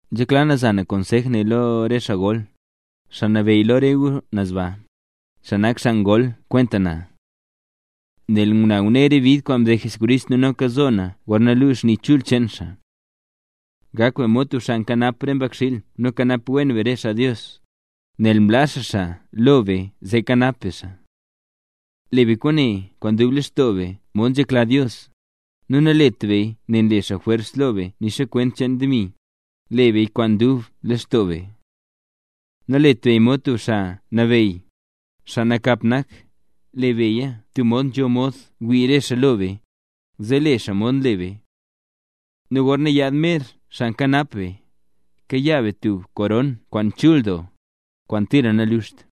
Nzhekla na za na konsej ne lo re xaa gol, xaa nabeyy lo re gu naz baa, xaa nak xaa gol kwenta na. Nel na ngune re bid kwaan mded Jesucrist nu noka zo na gorna luu xni chul cheen xaa. Gak be mod tub xaa nkanap re xmbakxiil nu kanap wen be re xaa Dios, nel mlaa xaa xaa lo be zee kanap be xaa. Le be kwaane kwaan dub lextoo be mod nzhekla Dios, nu nalet beya nel nle xaa jwers lo be nixa kwent cheen demi, le beya kwaan dub lextoo be. Nalet beya mod tub xaa nabeyy, xaa nakap nak, le beya tub mod nzho mod wii re xaa lo be, zee le xaa mod nle be. Nu gorna yaad mer Xaa Nkanap be, kayaa be tub koron kwaan chul doo, kwaan tira naluxt.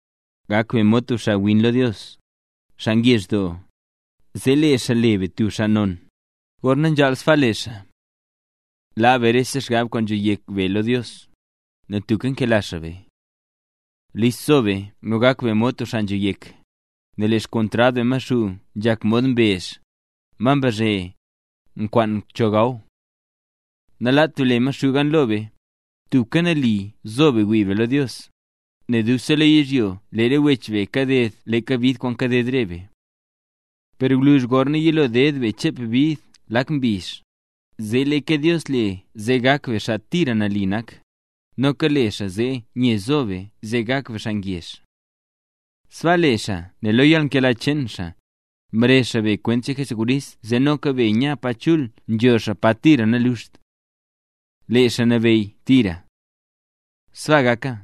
Gak be mod tub xaawin lo Dios, xaa ngezh doo, zee lee xaa le be tub xaa non, gorna nzhaal sbaa le xaa. Laa be rese xgab kwaan nzho yek be lo Dios, nel tubka nkela xaa be. List zo be nu gak be mod tub xaa nzho yek, nel lee xkontrad be Maxuu nzhak mod mbezh, ma mbazhe, nkwaan cho gaw. Nalaat be le Maxuu gan lo be, tubka nali zo be wii be lo Dios, nel ne be dubse lo yizhyo lee re wech be kaded leeka bid kwaan kaded re be. Per gwluzh, gorna yilo ded be chep bid lak mbizh, zee leeka Dios le zee gak be xaa tira nali nak, noka le xaa zee nye nzo be zee gak be xaa ngezh. Sbaa le xaa nel lo yalnkela cheen xaa, mrezh xaa be kwent cheen Jesucrist zee noka be nya pa chul nzho xaa, pa tira naluxt. ¡Lee xaa nabeyy tira! ¡Sbaa gaka!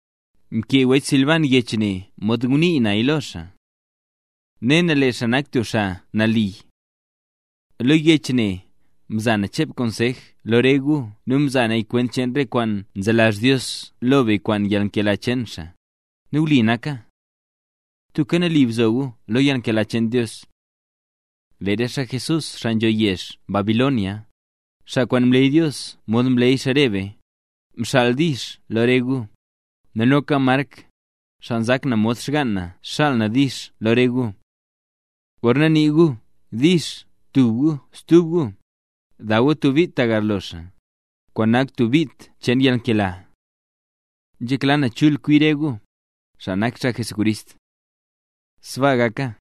Mkee wech Silban yech ne mod nzhé naya lo xaa. (Ne na lee xaa nak tub xaa nali.) Lo yech ne, mza na chep konsej lo re gu nu mza na kwent cheen re kwaan nzelazh Dios lo be kwaan yalnkela cheen xaa, nu wli naka. ¡Tubka nali bzo gu lo yalnkela cheen Dios! Lee re xaa Jesús, xaa nzho yezh Babilonia, xaa kwaan mleey Dios mod mleey xaa re be, nxaal “dix” lo re gu; nu noka Mark, xaa nzak na mod xgaan na nxaal “dix” lo re gu. Gorna nii gu “dix” tub gu stub gu, daw gu tub bit ta garlo xaa, kwaan nak tub bit cheen yalnkela. Nzhekla na chul kwi re gu, xaa nak xaa Jesucrist. Sbaa gaka.